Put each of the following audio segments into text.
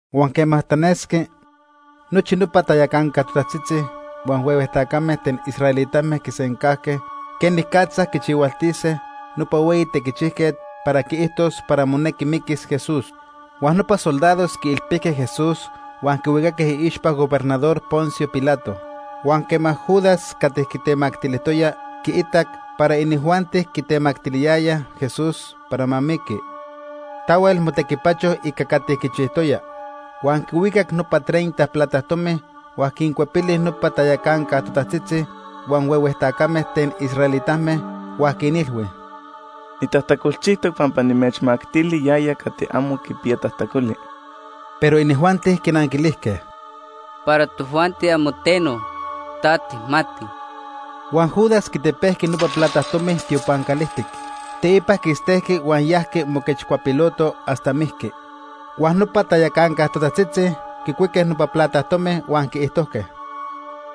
Huan quema tanesqui, nochi nopa tayacanca totajtzitzi huan huehue tacame ten israelitame quisencajque quenicatza quichihualtise nopa hueyi tequichijquet para quiijtos para monequi miquis Jesús. Huan nopa soldados quiilpijque Jesús huan quihuicaque iixpa gobernador Poncio Pilato. Huan quema Judas cati quitemactilijtoya quiitac para inijuanti quitemactiliyayaj Jesús para ma miqui, tahuel motequipacho ica cati quichijtoya. Huan quihuicac nopa treinta plata tomi, huan quincuepili nopa tayacanca totajtzitzi huan huehue tacame ten israelitame, huan quinilhui: ―Nitajtacolchijtoc pampa nimechmactili yaya cati amo quipiya tajtacoli. Pero inijuanti quinanquilijque: ―Para tojuanti amo teno. Ta tijmati. Huan Judas quitepejqui nopa plata tomi tiopan calijtic. Teipa quistejqui huan yajqui moquechcuapiloto hasta mijqui. Huan nopa tayacanca totajtzitzi quicuique nopa plata tomi huan quiijtojque: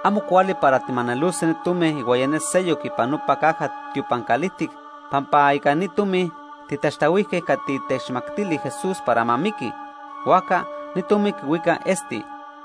―Amo cuali para tijmanelose ni tomi ihuaya ne seyoc ipan nopa caja tiopan calijtic pampa ica ni tomi tijtaxtahuijque cati techmactili Jesús para ma miqui, huajca ni tomi quihuica esti.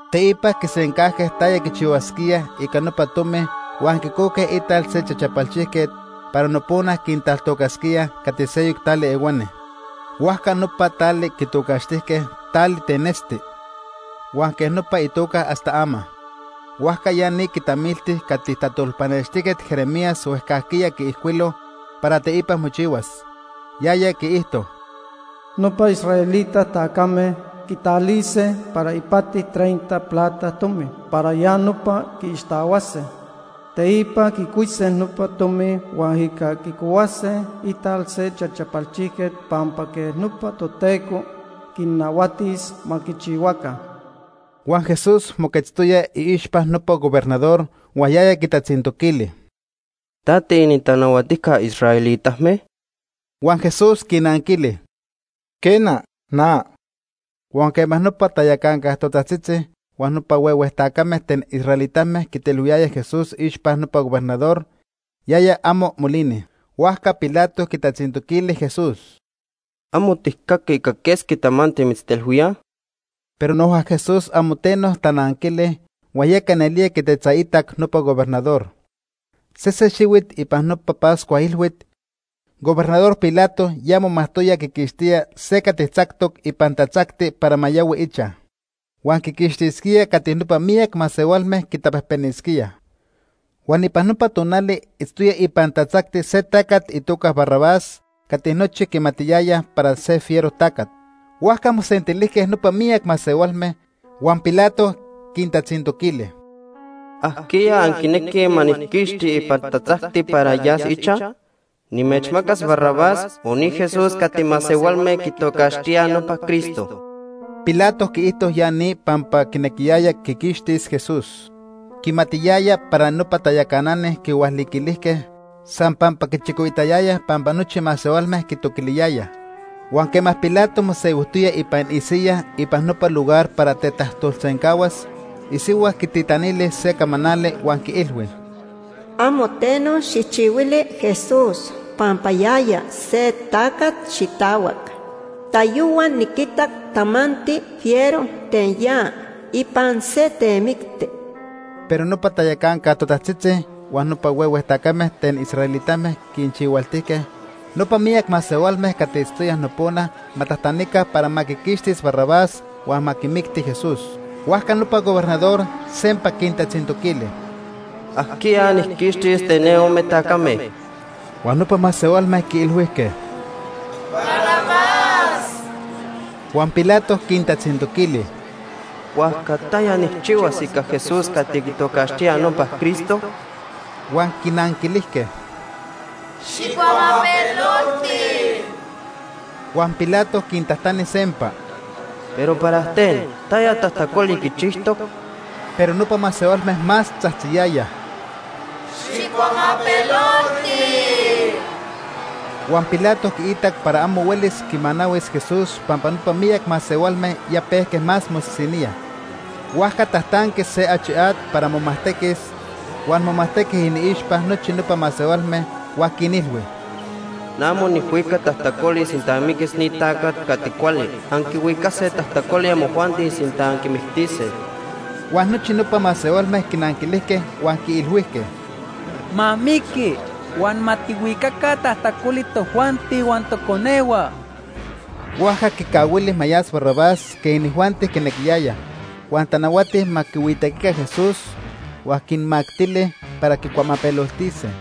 Teipa quisencajque taya quichihuasquíaj ica nopa tomi huan quicojque ital se chachapalchijquet para nopona quintaltocasquíaj cati seyoc tali ehuani. Huajca nopa tali quitocaxtijque Tali ten Esti. Huan quej nopa itoca hasta ama. Huajca ya ni quitamilti cati tajtolpanextijquet Jeremías huejcajquiya quiijcuilo para teipa mochihuas. Yaya quiijto: “Nopa israelita tacame quitalise para ipati treinta plata tomi para ya nopa quiixtahuase. Teipa quicuise nopa tomi huan ica quicohuase ital se chachapalchijquet pampa quej nopa Toteco quinnahuatis ma quichihuaca.” Huan Jesús moquetztoya iixpa gobernador huan yaya quitatzintoquili: ―¿Ta tiinintanahuatijca israelitame? Huan Jesús quinanquili: ―Quena, na. Huan quema nopa tayacanca totajtzitzi huan nopa huehue tacame ten israelitame quitelhuiyayaj Jesús iixpa nopa gobernador, yaya amo molini. Huajca Pilato quitatzintoquili Jesús: ―¿Amo tijcaqui ica quesqui tamanti mitztelhuíaj? Pero noja Jesús amo teno tananquili, huan yeca nelía quitetzaitac nopa gobernador. Sese xihuit ipan nopa Pascua ilhuit, Gobernador Pilato ya momajtoya quiquixtía se cati tzactoc ipan tatzacti para ma yahui ichaj. Huan quiquixtisquía cati nopa miyac masehualme quitapejpenisquíaj. Huan ipan nopa tonali itztoya ipan tatzacti se tacat itoca Barrabás cati nochi quimatiyayaj para se fiero tacat. Huajca mosentilijque nopa miyac masehualme, huan Pilato quintatzintoquili: ―¿Ajquiya anquinequij ma nijquixtis ipan tatzacti para yas ichaj? ¿Nimechmacas Barrabás o ni Jesús cati masehualme quitocaxtíaj nopa Cristo? Pilato quiijto ya ni pampa quinequiyaya quiquixtis Jesús. Quimatiyaya para nopa tayacanani quihualiquilijque san pampa quichicoitayayaj pampa nochi masehualme quitoquiliyayaj. Huan quema Pilato mosehuijtoya ipan isiyaj ipan nopa lugar para tetajtolsencahuas, isihua quititanili se camanali huan quiilhui: “Amo teno xijchihuili Jesús pampa yaya se tacat xitahuac. Tayohua niquitac tamanti fiero ten ya ipan se temicti.” Pero nopa tayacanca totajtzitzi huan nopa huehue tacame ten israelitame quinchihualtijque nopa miyac masehualme cati itztoyaj nopona ma tajtanica para ma quiquixtis Barrabás huan ma quimicti Jesús. Huajca nopa gobernador sempa quintatzintoquili: ―¿Ajquiya nijquixtis ten ne ome tacame? Huan nopa masehualme quiilhuijque: ―Barrabás. Huan Pilato quintatzintoquili: ―Huajca ¿taya nijchihuas ica Jesús cati quitocaxtíaj nopa Cristo? Huan quinanquilijque: ―Xijcuamapelolti. Huan Pilato quintajtani sempa: ―Pero ¿para ten? ¿Taya tajtacoli quichijtoc? Pero nopa masehualme más tzajtziyayaj: ―Xijcuamapelolti. Huan Pilato quiitac para amo huelis quimanahuis Jesús pampa nopa miyac masehualme ya pejque más mosisiníaj. Huajca tajtanqui se achi at para momajtequis, huan momajtequi iniixpa nochi nopa masehualme, huan quinilhui: ―Na amo nijhuica tajtacoli sinta miquis ni tacat cati cuali. Anquihuicase tajtacoli amojuanti sinta anquimictise. Huan nochi nopa masehualme quinanquilijque huan quiilhuijque: ―Ma miqui huan ma tijhuicaca tajtacoli tojuanti huan toconehua. Huajca quincahuili ma yas Barrabás quej inijuanti quinequiyayaj, huan tanahuati ma quihuitequica Jesús huan quinmactili para quicuamapeloltise.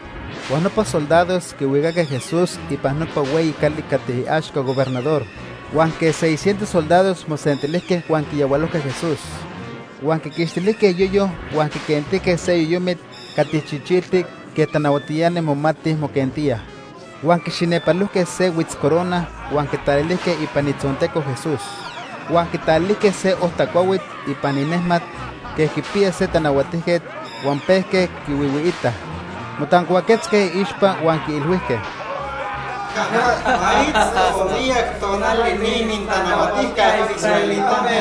Huan nopa soldados quihuicaque Jesús ipan nopa hueyi cali cati iaxca gobernador, huan quej seiscientos soldados mosentilijque huan quiyahualojque Jesús. Huan quiquixtilijque iyoyo huan quiquentijque se yoyomit cati chichiltic quej tanahuatiani momatij moquentíaj. Huan quixinepalojque se huitzcorona huan quitalilijque ipan itzonteco Jesús. Huan quitalilijque se ojta cuahuit ipan inejmat quej quipiya se tanahuatijquet huan pejque quihuihuiitaj. Motancuaquetzque iixpa huan quiilhuijque: ―¡Ma itzto miyac tonali ni inintanahuatijca israelitame!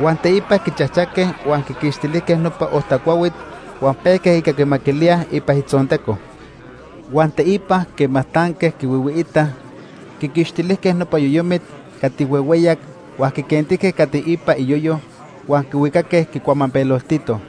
Huan teipa quichajchaque huan quiquixtilijque nopa ojta cuahuit huan pejque ica quimaquilíaj itzonteco. Huan teipa quema tanque quihuihuiitaj, quiquixtilijque nopa yoyomit cati huehueyac huan quiquentijque cati ipa iyoyo huan quihuicaque quicuamapeloltitoj.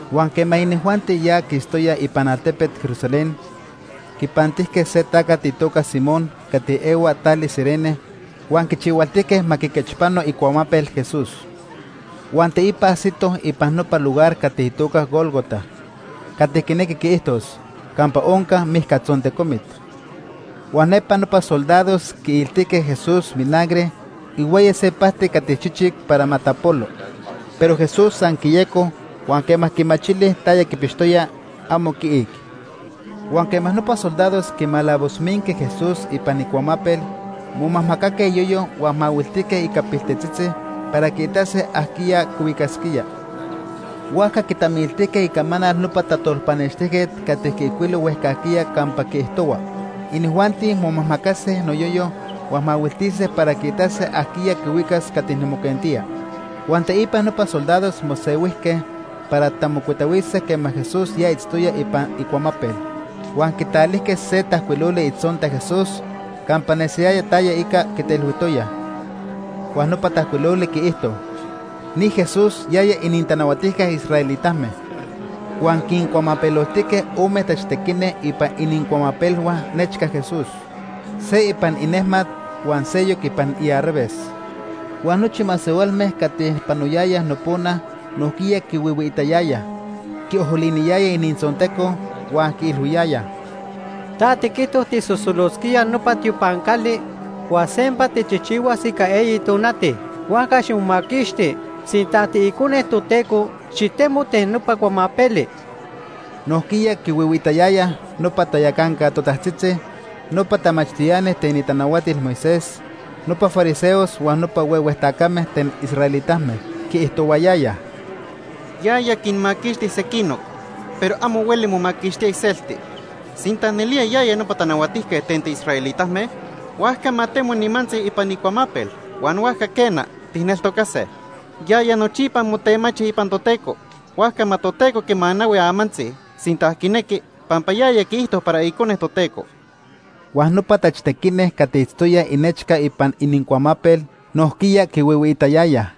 Huan quema inijuanti ya quistoyaj ipan altepet Jerusalén, quipantijque se tacat itoca Simón cati ehua tali Cirene huan quichihualtijque ma quiquechpano icuamapel Jesús. Huan teipa ajsitoj ipan nopa lugar cati itoca Gólgota (cati quinequi quiijtos “Campa Onca Mijcatzontecomit”). Huan nepa nopa soldados quiiltijque Jesús vinagre ihuaya se pajti cati chichic para ma tapolo. Pero Jesús san quiyeco huan quema quimachili taya quipixtoya, amo quiic. Huan quema nopa soldados quimalavoshuijque Jesús ipan icuamapel, momajmacaque iyoyo huan mahuiltijque ica piltetzitzi para quiitase ajquiya quihuicasquía. Huajca quitamiltijque icamanal nopa tajtolpanextijquet cati quiijcuilo huejcajquiya campa quiijtohua: “Inijuanti momajmacase noyoyo huan mahuiltise para quiitase ajquiya quihuicas cati nimoquentía.” Huan teipa nopa soldados mosehuijque para tamocuitahuise quema Jesús ya itztoya ipan icuamapel. Huan quitalijque se tajcuiloli itzonta Jesús campa nesiyaya taya ica quitelhuijtoyaj. Huan nopa tajcuiloli quiijto: NI JESÚS, YAYA ININTANAHUATIJCA ISRAELITAME. Huan quincuamapeloltijque ome tachtequini ipan inincuamapelhua nechca Jesús. Se ipan inejmat huan seyoc ipan iarraves. Huan nochi masehualme cati panoyayaj nopona nojquiya quihuihuiitayayaj. Quiojoliniyayaj inintzonteco, huan quiilhuiyayaj: ―Ta tiquijto tijsosolosquía nopa tiopan cali huan sempa tijchijchihuas ica eyi tonati. Huajca ximomaquixti. Sinta ta tiIcone Toteco, xitemo ten nopa cuamapeli. Nojquiya quihuihuiitayayaj nopa tayacanca totajtzitzi, nopa tamachtiani ten itanahuatil Moisés, nopa fariseos huan nopa huehue tacame ten israelitame. Quiijtohuayayaj: ―Yaya quinmaquixti sequinoc pero amo hueli momaquixtía iselti. Sinta nelía yaya nopa tanahuatijquet ten tiisraelitame, huajca ma temo nimantzi ipan icuamapel huan huajca, quena, tijneltocase. Yaya nochipa motemachi ipan Toteco, huajca ma Toteco quimanahui amantzi, sinta quinequi, pampa yaya quiijto para Icone Toteco. Huan nopa tachtequini cati itztoyaj inechca ipan inincuamapel, nojquiya quihuihuiitayayaj.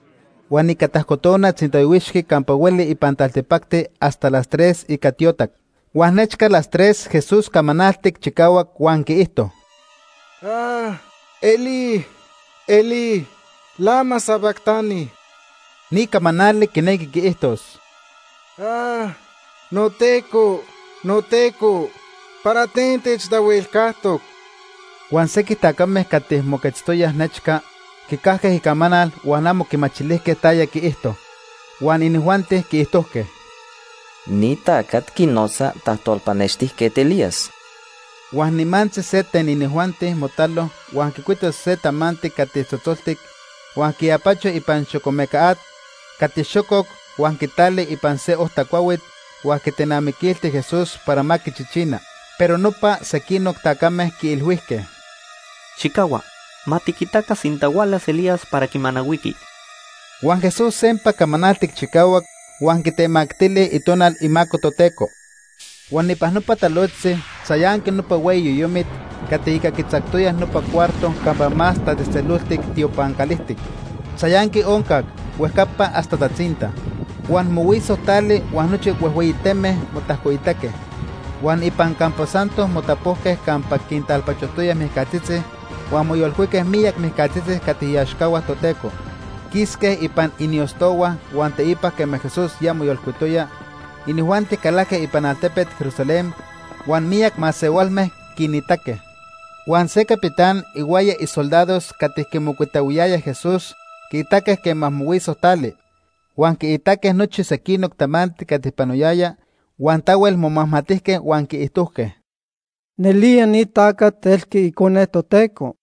Huan ica tajco tona tzintayohuixqui campa hueli ipan taltipacti hasta las tres ica tiotac. Huan nechca las tres Jesús camanaltic chicahuac huan quiijto: “Elí, Elí, ¿lama sabactani?” Ni camanali quinequi quiijtos: “NoTeco, noTeco, ¿para ten techtahuelcajtoc?” Huan sequij tacame cati moquetztoyaj nechca quicajque icamanal huan amo quimachilijque taya quiijto, huan inijuanti quiijtojque: ―Ni tacat quinotza tajtolpanextijquet Elías. Huan nimantzi se inijuanti motalo huan quicuito se tamanti cati tzotzoltic huan quiapacho ipan xocomeca at cati xococ huan quitali ipan se ojta cuahuit huan quitenamiquilti Jesús para ma quichichina. Pero nopa sequinoc tacame quiilhuijque: ―Xijcahua. Ma tiquitaca sinta hualas Elías para quimanahuiqui. Huan Jesús sempa camanaltic chicahuac huan quitemactili Itonal imaco Toteco. Huan ipan nopa talojtzi, tzayanqui nopa hueyi cortina cati ica quitzactoyaj nopa cuarto campa Más Tatzejtzeloltic tiopan calijtic. Tzayanqui oncac, huejcapa hasta tatzinta. Huan mohuiso tali huan nochi huejhueyi teme motajcoitaque. Huan ipan campo santo motapojque campa quintalpachojtoyaj mijcatzitzi huan moyolcuique miyac mijcatzitzi cati iaxcahua Toteco. Quisque ipan iniostohua huan teipa quema Jesús ya moyolcuitoya, inijuanti calajque ipan altepet Jerusalén huan miyac masehualme quinitaque. Huan se capitán ihuaya isoldados cati quimocuitahuiyayaj Jesús quiitaque quema mohuiso tali, huan quiitaque nochi sequinoc tamanti cati panoyaya, huan tahuel momajmatijque huan quiijtojque: ―Nelía ni tacat elqui Icone Toteco.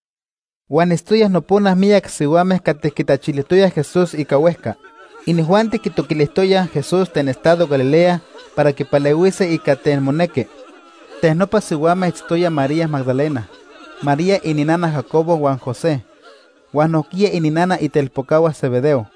Huan itztoyaj nopona miyac sihuame cati quitetzaitayayaj Jesús ica huejca. Inijuanti quitoquilijtoyaj Jesús ten estado Galilea para quipalehuise ica ten monejqui. Ipan nopa sihuame itztoyaj María Magdalena, María ininana Jacobo huan José, huan nojquiya ininana itelpocahua Zebedeo.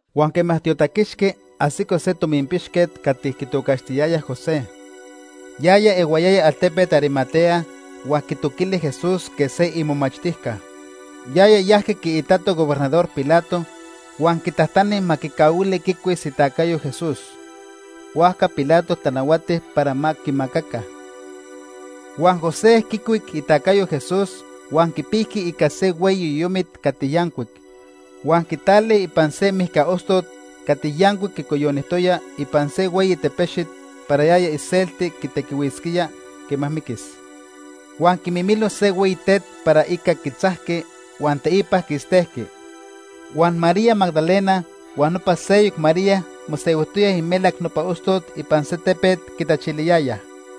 Huan quema tiotaquixqui, ajsico se tominpixquet cati quitocaxtiyayaj José. Yaya ehuayaya altepet Arimatea huan quitoquili Jesús quej se imomachtijca. Yaya yajqui quiitato gobernador Pilato huan quitajtani ma quicahuili quicuis itacayo Jesús. Huajca Pilato tanahuati para ma quimacaca. Huan José quicuic itacayo Jesús huan quipijqui ica se hueyi yoyomit cati yancuic. Huan quitali ipan se mijca ostot cati yancuic quicoyonijtoya ipan se hueyi tepexit para yaya iselti quitequihuisquía quema miquis. Huan quimimilo se hueyi tet para ica quitzajqui huan teipa quistejqui. Huan María Magdalena huan nopa seyoc María mosehuijtoyaj imelac nopa ostot ipan se tepet quitachiliyayaj.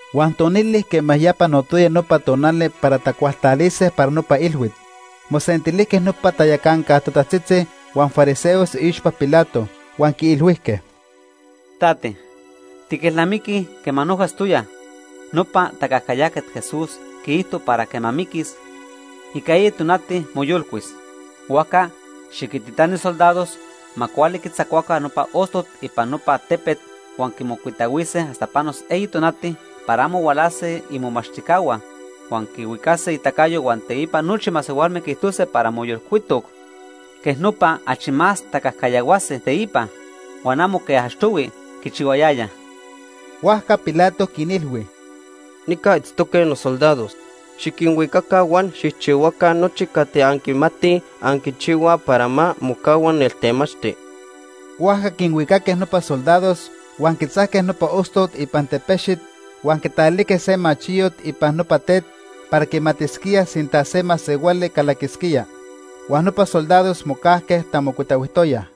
Huan tonili quema ya panotoya nopa tonali para tacualtalise para nopa ilhuit, mosentilijque nopa tayacanca totajtzitzi huan fariseos iixpa Pilato, huan quiilhuijque: ―Tate, tiquelnamiquij quema noja itztoya, nopa tacajcayajquet Jesús quiijto para quema miquis, ica eyi tonati moyolcuis. Huajca xiquintitani soldados ma cuali quitzacuaca nopa ostot ipan nopa tepet huan quimocuitahuise hasta panos eyi tonati para amo hualase imomachtijcahua huan quihuicase itacayo huan teipa nochi masehualme quiijtose para moyolcuitoc. Quej nopa achi más tacajcayahuase teipa, huan amo quej achtohui quichihuayayaj. Huajca Pilato quinilhui: ―Nica itztoque nosoldados. Xiquinhuicaca huan xijchihuaca nochi cati anquimatij anquichihuaj para ma mocahua neltemachti. Huajca quinhuicaque nopa soldados huan quitzajque nopa ostot ipan tepexit huan quitalijque se sello ipan nopa tet para quimatisquíaj sinta se masehuali calaquisquía. Huan nopa soldados mocajque tamocuitahuijtoyaj.